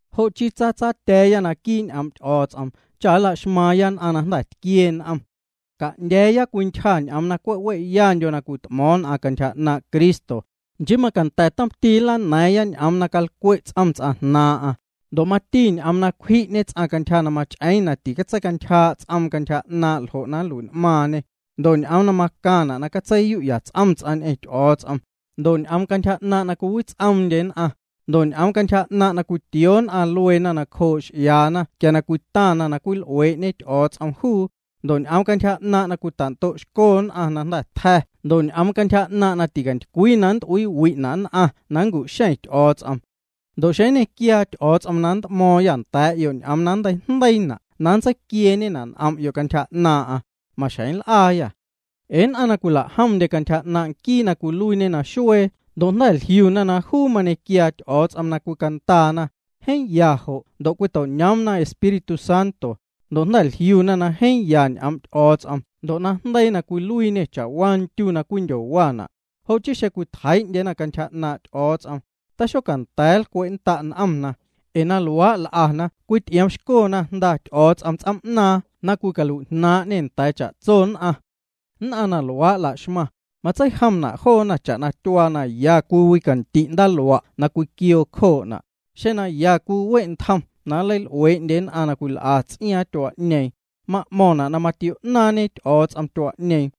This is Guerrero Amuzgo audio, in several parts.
Jo' chii tsatsatya̱a̱ya naquii' ñ'oom' Ty'o̱o̱ts'om cha nla'xmaaⁿya nn'aⁿ na jnda̱ tquiee n'om. Ca'ndya̱a̱ya cwii ntyja ñ'oom na cwe' we'yandyo na cwit'mo̱o̱ⁿ nn'aⁿ cantyja 'naaⁿ' Cristo, nchii macanda̱ tomti nlana̱a̱ⁿya ñ'oom na calcwe' ts'om ts'aⁿ jnaaⁿ'aⁿ, ndo' mati ñ'oom na cwji'ñe ts'aⁿ cantyja na mach'eeⁿ na titseicantyjaa' ts'oom na cantyja 'naaⁿ' jo' nlui'n'maaⁿñê, ndo' ñ'oom na macaⁿna' na catseiyu'ya ts'om ts'aⁿ ñ'eⁿ Ty'o̱o̱ts'om, ndo' ñ'oom cantyja 'naaⁿ' na cwiwits'oomndye nn'aⁿ, ndo' ñ'oom cantyja 'naaⁿ' na cwitioo nn'aⁿ lueena nacjoo' x'iaana quia cwitaⁿ nn'aⁿ na cwil'uee'ñe Ty'o̱o̱ts'om juu, ndo' ñ'oom cantyja 'naaⁿ' na cwitando'xco nn'aⁿ na jnda̱ tja̱ ndo' ñ'oom cantyja 'naaⁿ' na ticantycwii na nnt'uiiwi'na' nn'aⁿ na nncu'xeⁿ Ty'o̱o̱ts'om. Ndo' xeⁿ nñequiaa Ty'o̱o̱ts'om na nnt'mo̱o̱ⁿyâ nda̱a̱'yo' ñ'oom na nnteijndeiina' na nntseiquieeñena' n'om'yo' cantyja 'naaⁿ'aⁿ, maxjeⁿ nl'aayâ. Ee nn'aⁿ na cwila'jomndye cantyja 'naaⁿ' nquii na cwiluiiñe naxuee ndo' jnda̱ jliuna na juu na mañequiaa Ty'o̱o̱ts'om na cwicandaana, jeeⁿ ya juu jo' ndo' cwito'ñoomna Espíritu Santo, ndo' jnda̱ jliuna na jeeⁿ ya ñ'oom' Ty'o̱o̱ts'om ndo' najndeii na cwiluiiñê cha'waa ndyu ndo' ndyu na cwindyona', ndo' jnda̱ na tajnaaⁿ'na cha'tso nmeiⁿ', xeⁿ cwitjeii'ndyena cantyja 'naaⁿ' Ty'o̱o̱ts'om, xonda̱a̱ nlcwe'nnda' n'omna, ee na luaa' l'ana cwity'ioomxcona Jnda Ty'o̱o̱ts'om ts'oom'naaⁿ na cwilui'jnaaⁿñê nda̱a̱ cha'tso nn'aⁿ. Nn'aⁿ na luaa' la'xmaⁿ, matseijomna' joona cha'na tyuaa na ya cwiwicandi' ndaaluaa' na cwiquioo cjoo'na', xeⁿ ya cwiwe' ntjom na nleil'uee'ñe ts'aⁿ na tyoch'ee ts'iaaⁿ, ma'mo̱ⁿna' na matio'ñaaⁿñe Ty'o̱o̱ts'om tyuaa'ñeeⁿ,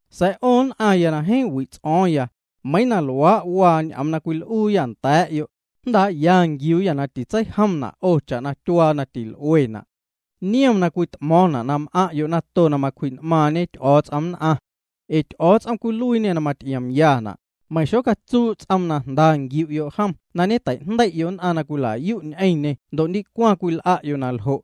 Sa̱a̱ 'o nn'aⁿya na jeeⁿ wi' n'o̱o̱ⁿyâ, meiiⁿ na luaa' waa ñ'oom na cwil'uuyâ nda̱a̱'yo', jndaa'ya nquiuuyâ na titseijomna' 'o cha'na tyuaa na til'uena'. Niom na cwit'mo̱o̱ⁿna' na m'aⁿ'yo' nato na macwji'n'maaⁿñe Ty'o̱o̱ts'om nn'aⁿ. Ee Ty'o̱o̱ts'om cwiluiiñê na maty'iomyana', meiⁿ xocatsuu' ts'oom na jnda nquiu'yo' jom na ñeteijndei'yo' nn'aⁿ na cwila'yu' ñ'eⁿñê ndo' ndicwaⁿ cwil'a'yo' na ljo'.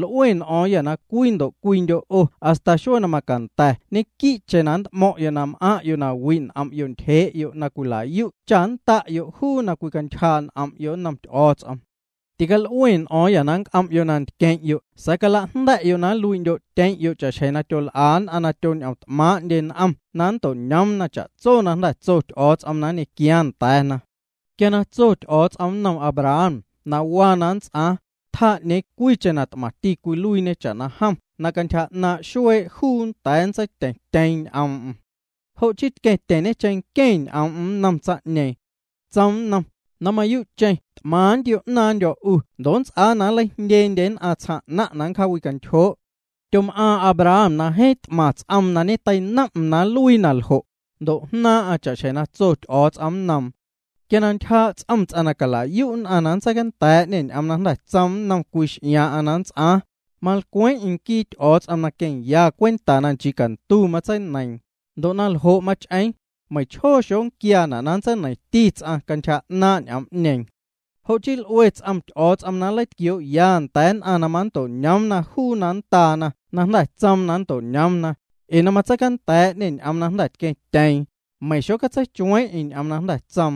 L'ue n'o̱o̱ⁿyâ na cwii cwiindyo' 'o hasta xuee na macanda̱ ñequii'cheⁿ nnt'mo̱ⁿ'yo' na m'aⁿ'yo' na wi' n'om' ntyjee'yo' na cwila'yu' cha nnda'yo' juu na cwicantyjaa' n'om'yo' nnom Ty'o̱o̱ts'om. Til'ue n'o̱o̱ⁿyâ na nnc'om'yo' na ntqueⁿ'yo' sa̱a̱ calajnda̱'yo' na nluii'ndyo'tyeⁿ'yo' cha'xjeⁿ tyol'a nn'aⁿ na tyoñ'omt'maaⁿ'ndyena n'omna na nnto'ñoomna cha'tso na jnda̱ tso Ty'o̱o̱ts'om na nñequiaaⁿ nda̱a̱na. Quia na tso Ty'o̱o̱ts'om ñ'oom nnom Abraham waa na nnts'aaⁿ, tjaa 'ñeeⁿ cwiicheⁿ na t'maⁿti cwiluiiñe cha'na jom na cantyja 'naaⁿ' xuee' juu nnda̱a̱ nntseityeⁿtyeeⁿ ñ'oom'm. Jo' chii tqueⁿtyeⁿñe cheⁿnqueⁿ ñ'oom'm nnom tsaⁿ'ñeeⁿ. Tsoom nnom: “Na mayuu'cheⁿ t'maⁿ nntio̱'naaⁿndyo̱ 'u ndo' nnts'aa na nleijndyendye nn'aⁿ tsjaaⁿ 'naⁿ' na nncjawintyjoo'.” Tyom'aaⁿ Abraham na jeeⁿ t'maⁿ ts'oom na ñeteinom'm na nluii na ljo', ndo' jnaaⁿ'aⁿ cha'xjeⁿ na tso Ty'o̱o̱ts'om nnoom. Quia na ntyjaa' ts'om ts'aⁿ na cala'yu' nn'aⁿ na nntseicanda̱a̱'ñê ñ'oom na jnda̱ tsoom nnom cwii x'iaaⁿ'aⁿ na nnts'aaⁿ, malcweeⁿ'eⁿ nquii Ty'o̱o̱ts'om na queⁿya cwenta na nchii cantu matseineiiⁿ. Ndo' na ljo' mach'eeⁿ, meiⁿchjoo xonquiaana' na nntseineiⁿti ts'aⁿ cantyja 'naaⁿ' ñ'oom'ñeeⁿ. Jo' chii l'ue ts'om Ty'o̱o̱ts'om na nleitquioo'ya nda̱a̱ nn'aⁿ na manto'ñoomna juu na nndaana na jnda̱ tsoom na nnto'ñoomna, ee na nntseicanda̱a̱'ñê ñ'oom na jnda̱ tqueⁿtyeeⁿ, meiⁿ xocatseichueeⁿ'eⁿ ñ'oom na jnda̱ tsoom.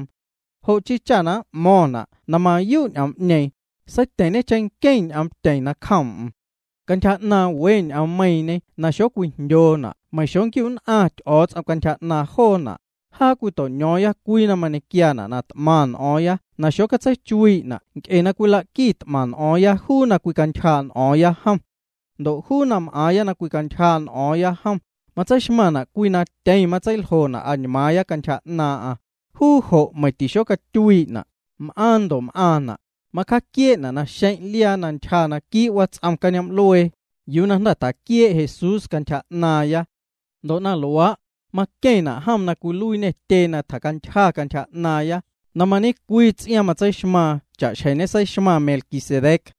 Jo' chii cha na m'mo̱ⁿna' na mayuu' juu ñ'oom'ñeeⁿ, seityeⁿñê cheⁿnqueⁿ ñ'oomtyeⁿ nacjoom'm. Cantyja 'naaⁿ we nnom ñ'oommeiiⁿñe na xocwijndyoona' meiⁿ xonquiu'nn'aⁿ Ty'o̱o̱ts'om cantyja 'naaⁿ joona', jaa cwito'ño̱o̱ⁿya cwii na mañequiaana' na t'maⁿ n'o̱o̱ⁿya na xotseichuii'na' nc'e cwila'quit'maⁿ n'o̱o̱ⁿya juu na cwicantyjaa' n'o̱o̱ⁿya jom. Ndo' juu na m'aaⁿya na cwicantyjaa' n'o̱o̱ⁿya jom, matseixmaⁿna' cwii na tyeⁿ matseiljona' añmaaⁿya cantyja 'naaⁿ'aⁿ. Juu jo' meiⁿ tixocatyuii'na', m'aaⁿ ndo' m'aaⁿna'. Macjaquiee'na' naxeⁿ' liaa na ntyja quii' wats'om cañoom'luee, yuu na jnda̱ tjaquiee' Jesús cantyja 'naaⁿya. Ndo' na luaa', maqueⁿna' jom na cwiluiiñê tyee na tjacantyja cantyja 'naaⁿya, na mañecwii ts'iaaⁿ matseixmaaⁿ cha'xjeⁿ ñeseixmaⁿ Melquisedec.